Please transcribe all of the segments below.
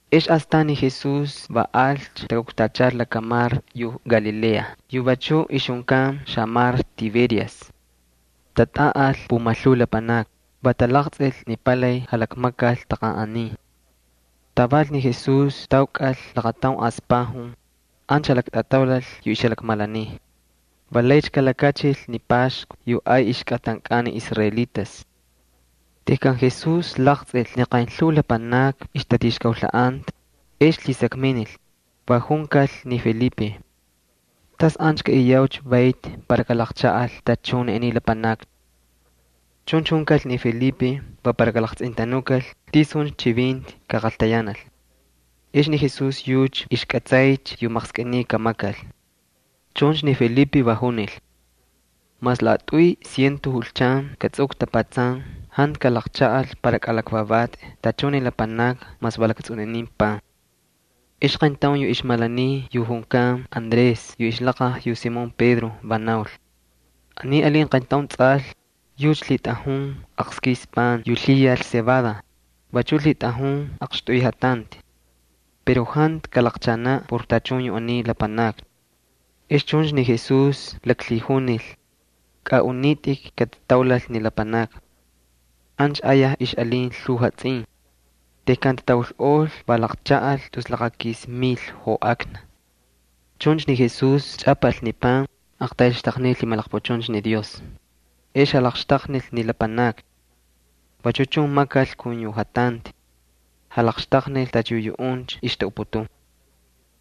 Ex astan ni Jesús va alcha takukchal lakamar Galilea yu vachuꞌ ixjunkan lakamar Tiberias. Tatꞌaꞌal pumalhuu lapanakni, va talaqtsꞌil ni palay jalakmakal taqanꞌanin. Taval ni Jesús taukꞌal laqataun aspajun, ancha jalaktꞌataulal yu ixjalakmalaniy. Va laycha kalakachil ni Paxku yu ay ixkꞌatankꞌan ni israelitas. Tejkan Jesús laqtsꞌil ni qaynlhuu lapanakni ixtatixkaulhaꞌanta, ex lhisakminil, va junkal ni Felipe: —¿Tas ancha kaꞌiyaucha vayti para kalaqchaꞌal tachun yu aniy lapanakni? Chuncha junkal ni Felipe va para kalaqtsꞌintanukal tisuncha chivinti kaqaltayanal. Ni Jesús yucha ixkꞌatsaycha yu maqskꞌiniy kamakal. Chuncha ni Felipe va junil: —Mas laꞌatꞌuy ciento julchan katsꞌukꞌu tapatsan jantu kalaqchaꞌal para kꞌalakvavatꞌi tachun ni lapanakni mas va laktsꞌuninin pan. Ex aqayntaun yu ixtꞌaltanaꞌ yu junkan Andrés yu ixlaqaj yu Simón Pedro va naul: —Aniy alin qayntaun tsꞌal. Yucha lhitꞌajun aqskis pan yu lhiyal cebada, vachu lhitꞌajun aqxtꞌuy jatanti. Pero jantu kalaqchaanaꞌ por tachun yu aniy lapanakni. Ex chuncha ni Jesús laklhijunil: —Kꞌaꞌunitꞌik katataulal ni lapanakni. Ancha ayaj ixꞌalin lhuu jatsꞌin. Tejkan tataulꞌol va laqchaꞌal tus laqakis mil joꞌakna. Chuncha ni Jesús chꞌapal ni pan, aqtayl xtaqniy lhimalaqpuchuncha ni Dios. Ex jalaqxtaqnil ni lapanakni. Vachu chun makal kun yu jatanti. Jalaqxtaqnil tacha yu yuꞌuncha ixtaꞌuputun.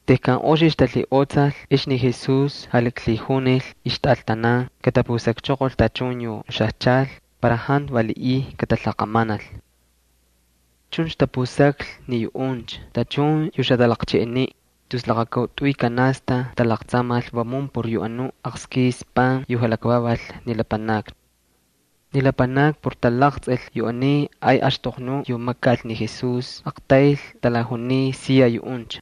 Tejkan oxicha talhiꞌotsaꞌol ex ni Jesús jalaklhijunil ixtꞌaltanan katapusakchoqol tachun yu xajchal para jantu valiꞌiy katalaqamanal. Chuncha tapusaklhi ni yuꞌuncha tachun yu xatalaqcheꞌeniꞌ, tus laqakautꞌuy canasta talaqtsamal vamun por yu anuꞌ aqskis pan yu jalakvaval ni lapanakni. Ni lapanakni por talaqtsꞌil yu aniy ay axtoqnu yu makal ni Jesús aqtayl talajuniy siya yuꞌuncha: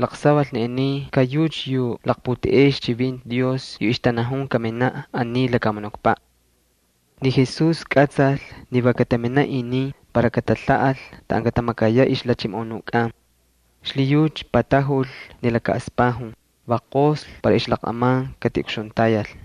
—Laqsaval ni aniy ka yucha yu laqputeꞌey ixchivinti Dios yu ixtanajun kaminaꞌ aniy lakamunukpaꞌ. Ni Jesús kꞌatsal ni va kataminaꞌ inin para katalhaꞌal taꞌan katamakayaꞌ ixjalhachimoꞌonukꞌan. Xlhiyucha taꞌeltajuchoqol laka aspajun, va qoslhi para ixlaqꞌaman katiꞌukxuntayal.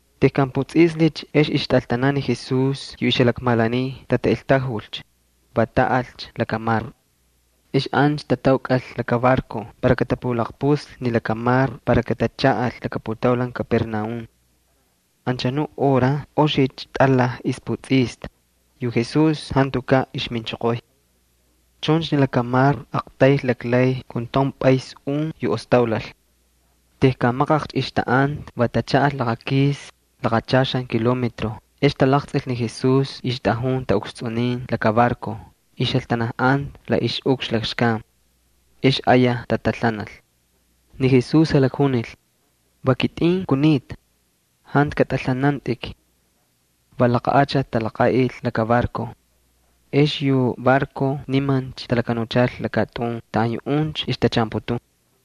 Tejkan putsꞌislhicha ex ixtꞌaltanan ni Jesús yu ixjalakmalaniy tataꞌeltajulcha, va taꞌalcha lakamar. Ex ancha tataukꞌal laka barco para katapalaqpuslhi ni lakamar para katachaꞌal laka putaulan Capernaúm. Anchanuꞌ hora oxicha tꞌalaj ixputsꞌista, yu Jesús jantukaꞌ ixminchoqoy. Chuncha ni lakamar aqtayl laklay kun taun pꞌas un yu ostaulal. Tejkan maqaqcha ixtaꞌanta va tachaꞌal laqakis, laqachaxan kilometro ex talaqtsꞌil ni Jesús ixtꞌajun taꞌukstsꞌunin laka barco, ixjaltanajꞌanta la ixꞌukxna lakxkan. Ex ayaj tatalhanal. Ni Jesús jalakjunil: —Va kitꞌin kunita. Jantu katꞌalhanantꞌik. Va laqa achati talaqaꞌil laka barco. Ex yu barco nimancha talakanuchal lakatꞌun taꞌan yuꞌuncha ixtachaanputun.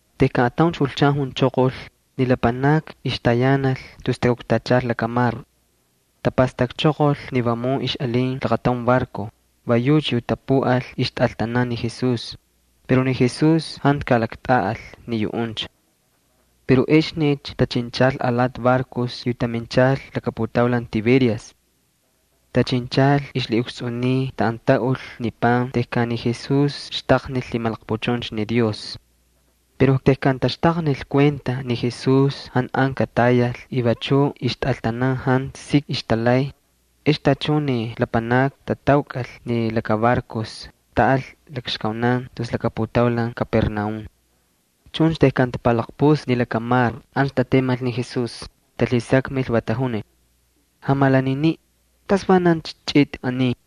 Tejkan atauncha julchan junchoqol, ni lapanakni ixtayanal tus takuktachal lakamar. Tapastakchoqol ni vamun ixꞌalin laqataun barco, va yucha yu tapuꞌal ixtꞌaltanan ni Jesús, pero ni Jesús jantu kalaktꞌaꞌal ni yuꞌuncha. Pero exnicha tachinchal alati barcos yu taminchal laka putaulan Tiberias. Tachinchal ixlhiꞌukstsꞌuniy taꞌan taꞌul yu pan tejkan ni Jesús xtaqnil lhimalaqpuchuncha ni Dios. Pero tejkan taxtaqnil kuenta ni Jesús jantu an katayal y vachu ixtꞌaltanan jantu sik ixtalay, ex tachun ni lapanakni tataukꞌal ni laka barcos, taꞌal lakxkaunan tus laka putaulan Capernaúm. Chuncha tejkan tapalaqpuslhi ni lakamar ancha tatemal ni Jesús, talhisakmil, va tajunil: —Jamalaniniꞌ, ¿tasvanancha chꞌitꞌi aniy?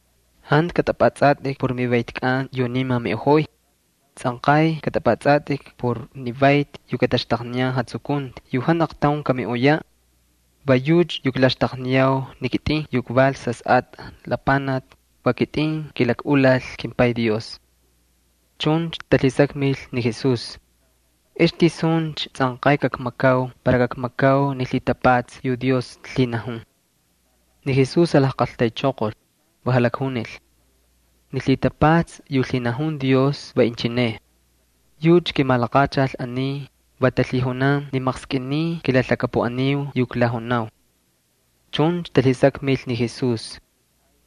Jantu kꞌatꞌapꞌatsꞌatꞌik por mivaytkꞌan yu niman miꞌojoy. Tsꞌanqay kꞌatꞌapꞌatsꞌatꞌik por ni vayti yu kataxtaqniyan jatsukunti yu jantu aqtaun kamiꞌoyaꞌ. Va yucha yu klaxtaqniyau ni kitꞌin yu kval Sasꞌatꞌa Lapanaki, va kitꞌin kilakꞌulal kimPay Dios. Chuncha talhisakmil ni Jesús: —¿Ex tisuncha tsꞌanqay kakmakau para kakmakau ni lhitapatsa yu Dios lhinajun? Ni Jesús jalajqaltaychoqol, va jalakjunil: —Ni lhitapatsa yu lhinajun Dios va inchineꞌ. Yucha kimalaqachal aniy, va talhijunan ni maqskꞌiniy kilalhakapuꞌaniu yu klajunau. Chuncha talhisakmil ni Jesús: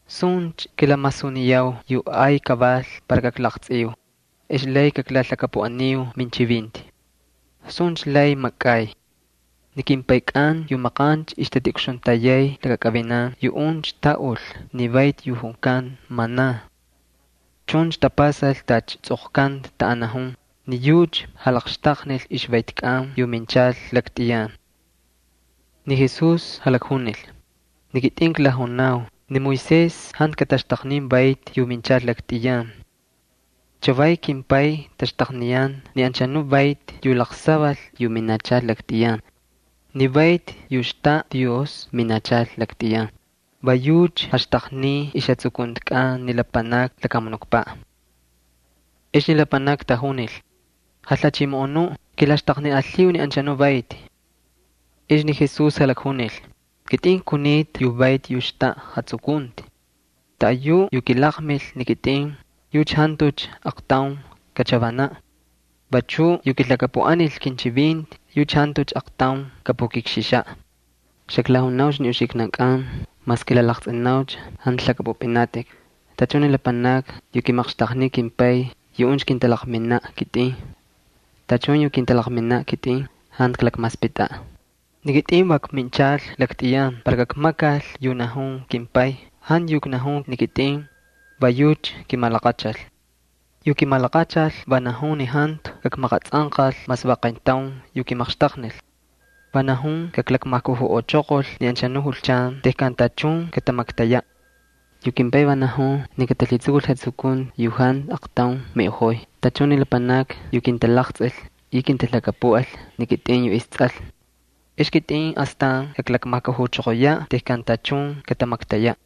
—¿Suncha kilamasuniyau yu ay kaval para kaklaqtsꞌiu? Ex lay kaklalhakapuꞌaniu minchivinti. ¿Suncha lay makꞌay? Ni kimpaykꞌan yu maqancha ixtatiꞌukxuntayay lakakꞌivinan yuꞌuncha taꞌul ni vayti yu junkan maná. Chuncha tapasal tacha tsꞌoqkanta taꞌan najun: “Ni yucha jalaqxtaqnil ixvaytkꞌan yu minchal laktꞌiyan.” Ni Jesús jalakjunil: —Ni kitꞌin klajunau. Ni Moisés jantu kataxtaqnin vayti yu minchal laktꞌiyan. Chavay kimPay taxtaqniyan ni anchanu vayti yu laqsaval yu minachal laktꞌiyan. Ni vayti yu xtaꞌa Dios minachal laktꞌiyan, va yucha jaxtaqniy ixjatsukuntikꞌan ni lapanakni lakamunukpaꞌ. Ex ni lapanakni tajunil: —Jalhachimoꞌonuꞌ, kilaxtaqniꞌalhiu ni anchanuꞌ vayti. Ex ni Jesús jalakjunil: —Kitꞌin kunita yu vayti yu xtaꞌa jatsukunti. Taꞌayuꞌ yu kilaqmil ni kitꞌin yucha jantucha aqtaun kachavanaꞌ. Vachu yu kilhakapuꞌanil kinchivinti yucha jantucha aqtaun kapukikxixaꞌ. Xaklajunaucha ni uxiknankꞌan mas kilalaqtsꞌinaucha jantu lhakꞌapꞌupꞌinatꞌik. Tachun ni lapanakni yu kimaqxtaqniy kimPay yuꞌuncha kintalaqminaꞌ ni kitꞌin. Tachun yu kintalaqminaꞌ kitꞌin jantu klakmaspꞌitꞌaꞌ. Ni kitꞌin va kminchal laktꞌiyan para kakmakal yu najun kimPay, jantu yu knajun ni kitꞌin. Va yucha kimalaqachal. Yu kimalaqachal va najun ni jantu kakmaqatsꞌanqal mas va qayntaun yu kimaqxtaqnil. Va najun kaklakmajkujuꞌochoqol ni anchanuꞌ julchan tejkan tachun katamaktayaꞌ. Yu kimPay va najun ni katalhitsukul jatsukunti yu jantu aqtaun kamiꞌoyaꞌ tachun ni lapanakni yu kintalaqtsꞌil y kintalhakapuꞌal ni kitꞌin yu isTsꞌal. Ex kitꞌin astan kaklakmajkujuchoqoyaꞌ tejkan tachun katamaktayaꞌ.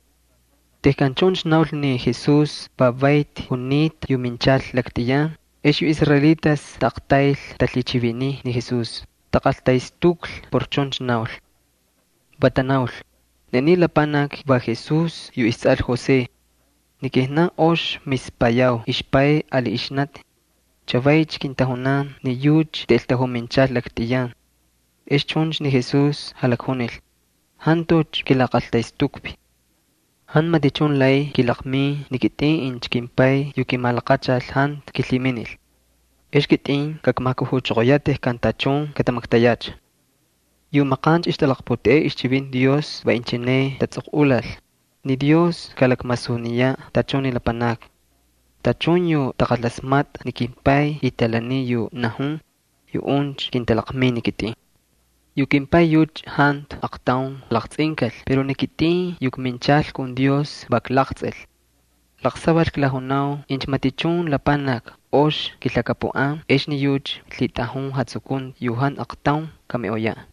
Tejkan chuncha naul ni Jesús va vayti junita yu minchal laktꞌiyan, ex yu israelitas taꞌaqtayl talhichiviniy ni Jesús, taqaltaꞌestuklhi por chuncha naul. Va tanaul: —Ni aniy lapanaki va Jesús yu istsꞌal José. Ni kijnan ox mispayau ixpay ali ixnati. ¡Chavaycha kintajunan ni yucha taꞌeltajuminchal laktꞌiyan! Ex chuncha ni Jesús jalakjunil: —Jantucha kilaqaltaꞌestukvi. Jantu matichun lay kilaqmin ni kitꞌin incha kimPay yu kimalaqachal jantu kilhiminil. Ex kitꞌin kakmajkujuchoqoyaꞌ tejkan tachun katamaktayacha. Yu maqancha ixtalaqputeꞌey ixchivinti Dios va inchine tatsꞌoqꞌulal: “Ni Dios kalakmasuniyaꞌ tachun ni lapanakni.” Tachun yu taqalasmatꞌa ni kimPay y talaniy yu najun, yuꞌuncha kintalaqmin ni kitꞌin. ’Yu kimPay yucha jantu aqtaun kalaqtsꞌinkal pero ni kitꞌin yu kminchal kun Dios va klaqtsꞌil. Laqsaval klajunau incha matichun lapanaki ox kilhakapuꞌan ex ni yucha lhitꞌajun jatsukunti yu jantu aqtaun kamiꞌoyaꞌ.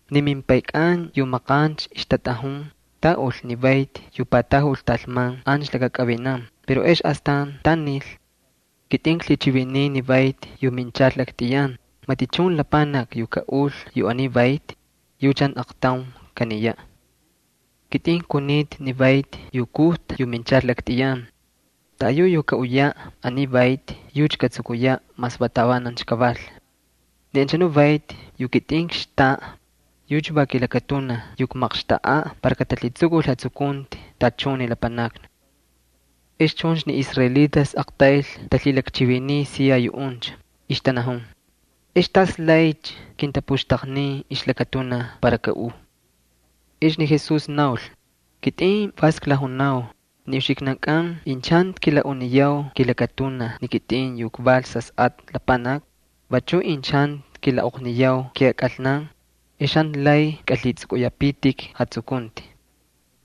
Ni mimpaykꞌan yu maqancha ixtatꞌajun, taꞌul ni vayti yu patajul talman ancha lakakꞌivinan pero ex astan tanil. Kitꞌin klhichiviniy ni vayti yu minchal laktꞌiyan, matichun lapanaki yu kaꞌul yu aniy vayti, yucha jantu aqtaun kaniyaꞌ. Kitꞌin kunita ni vayti yu kujta yu minchal laktꞌiyan. Taꞌayu yu kaꞌuyaꞌ aniy vayti yucha katsukuyaꞌ mas va tavanancha kaval. Ni anchanu vayti yu kitꞌin kxtaꞌa yucha va kilakatunaj yu kmaqxtaꞌa para katalhitsukul jatsukunti tachun ni lapanakni. Ex chuncha ni israelitas aqtayl talhilakchiviniy siya yuꞌuncha, ixtanajun: —¿Ex tas laycha kintapuxtaqnin ixlakatunaj para kaꞌuu? Ex ni Jesús naul: —Kitꞌin vas klajunau ni uxiknankꞌan incha jantu kilaꞌuniyau kilakatunaj ni kitꞌin yu kval Sasꞌatꞌa Lapanaki, vachu incha jantu kilaꞌoqniyau kijakꞌalnan, ex jantu lay kꞌalhitsꞌukꞌuyapitik jatsukunti.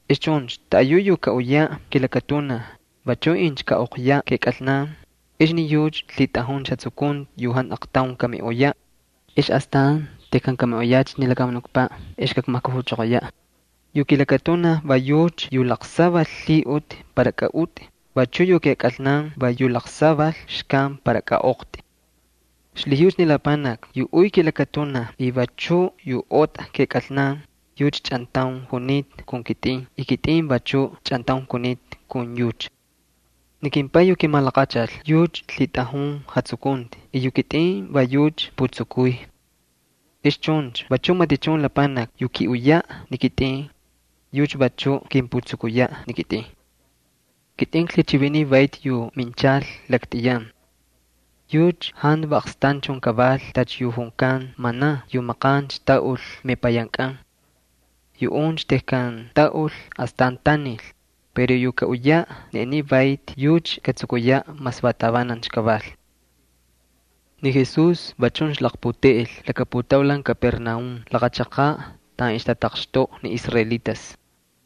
Ex chuncha taꞌayuꞌ yu kaꞌuyaꞌ kilakatunaj, vachuꞌ incha kaꞌoqyaꞌ kijakꞌalnan, ex ni yucha lhitꞌajuncha jatsukunti yu jantu aqtaun kamiꞌoyaꞌ. Ex astan tejkan kamiꞌoyacha ni lakamunukpaꞌ ex kakmajkujuchoqoyaꞌ. Yu kilakatunaj va yucha yu laqsaval lhiꞌuti para kaꞌutꞌi, vachu yu kijakꞌalnan va yu laqsaval xkan para kaꞌoqtꞌi. Xlhiyucha ni lapanaki yu uy kilakatunaj y vachuꞌ yu otꞌa kijakꞌalnan, yucha chꞌantaun junita kun kitꞌin y kitꞌin vachuꞌ chꞌantaun kunita kun yucha. Ni kimPay yu kimalaqachal yucha lhitꞌajun jatsukunti y yu kitꞌin va yucha kputsukuy. Ex chuncha vachuꞌ matichun lapanaki yu kiꞌuyaꞌ ni kitꞌin, yucha vachuꞌ kimputsukuyaꞌ ni kitꞌin. Kitꞌin klhichiviniy vayti yu minchal laktꞌiyan. Yucha jantu va aqstanchun kaval tacha yu junkan maná yu maqancha taꞌul mepayankꞌan. Yuꞌuncha tejkan taꞌul astan tanil. Pero yu kaꞌuyaꞌ ni aniy vayti yucha katsukuyaꞌ mas va tavanancha kaval. Ni Jesús va chuncha laqputeꞌel laka putaulan Capernaúm laqa chaqaꞌ taꞌan ixtataqxtoꞌa ni israelitas.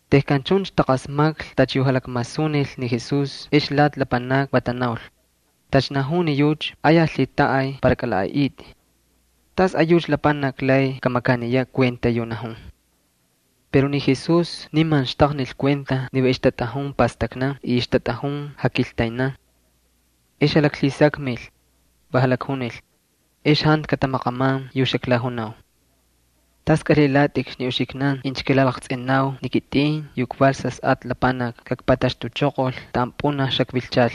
Tejkan chuncha taqasmaklhi tacha yu jalakmasunil ni Jesús ex lati lapanakni va tanaul: —Tacha najun ni yucha ayaj lhitaꞌay para kꞌalaꞌaꞌitꞌi. ¿Tasꞌayucha lapanaki lay kamakaniyaꞌ kuenta yu najun? Pero ni Jesús niman xtaqnil kuenta ni va ixtatꞌajun pastaknan y ixtatꞌajun jakiltaynan. Ex jalhisakmil, va jalakjunil: —¿Ex jantu katamaqaman yu xaklajunau? ¿Tas kꞌalhilatꞌikcha ni uxiknan incha kilalaqtsꞌinau ni kitꞌin yu kval Sasꞌatꞌa Lapanaki kakpataxtuchoqol taꞌan pꞌunaj xakvilchal?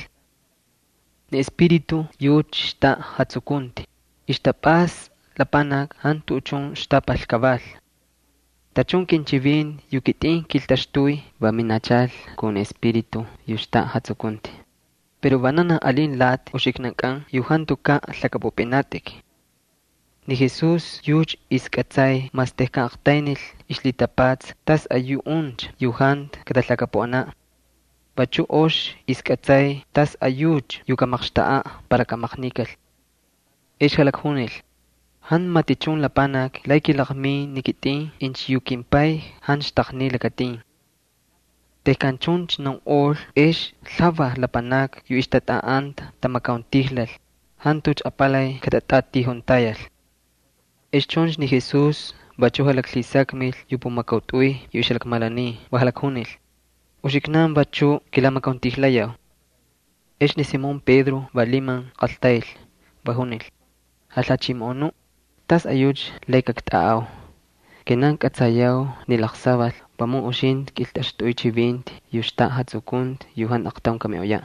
Ni Espíritu yucha xtaꞌa jatsukunti, ixtapꞌasta lapanaki jantu tuꞌuchun ixtapal kaval. Tachun kinchivinti yu kitꞌin kiltaxtuy va minachal kun ni Espíritu yu xtaꞌa jatsukunti. Pero vananaj alin lati uxiknankꞌan yu jantukaꞌ lhakꞌapꞌupꞌinatꞌik. Ni Jesús yucha ixkꞌatsay mas tejkan aqtaynil ixlhitapatsa tasꞌayuꞌuncha yu jantu katalhakapuꞌanaꞌ. Vachu ox ixkꞌatsay tasꞌayucha yu kamaqxtaꞌaꞌ para kamaqnikal. Ex jalakjunil: —Jantu matichun lapanaki lay kilaqmin ni kitꞌin incha yu kimPay jantu xtaqniy lakatin. Tejkan chuncha naunꞌol ex lhuvaj lapanakni yu ixtatꞌaꞌanta tamakauntijlal, jantucha apalay katatijuntayal kun yucha. Ex chuncha ni Jesús vachuꞌ jalaklhisakmil yu pumakautꞌuy yu ixjalakmalaniy va jalakjunil: —¿Uxiknan vachuꞌ kilamakauntijlayau? Ex ni Simón Pedro va liman qaltayl, va junil: —Jalhachimoꞌonuꞌ, ¿tasꞌayucha lay kaktꞌaꞌau? Kijnan kꞌatsayau ni laqsaval vamun uxintꞌi kꞌiltꞌaxtꞌuy chivinti yu xtaꞌa jatsukunti yu jantu aqtaun kamiꞌoyaꞌ.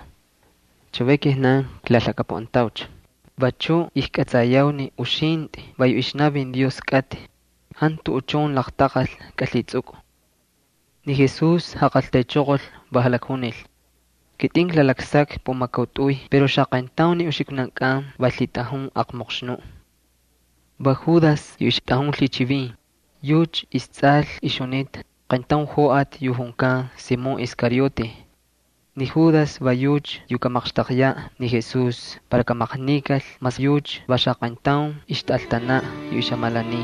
Chavay kijnan klalhakapuꞌantaucha, vachuꞌ ijkꞌatsayau ni uxintꞌi va yu ixnavin Dios kꞌatꞌi, jantu tuꞌuchun laqtaqal kꞌalhitsꞌukꞌu. Ni Jesús jaqaltaychoqol, va jalakjunil: —Kitꞌin klalaksakvi pumakautꞌuy pero xaqayntaun ni uxiknankꞌan va lhitꞌajun aqmoqxnuꞌ. Va Judas yu ixtꞌajun lhichivin. Yucha istsꞌal ixjunita qayntaun joꞌati yu junkan Simón Iscariote. Ni Judas va yucha yu kamaqxtaqyaꞌ ni Jesús para kamaqnikal mas yucha va xaqayntaun ixtꞌaltanaꞌ yu ixjamalaniy.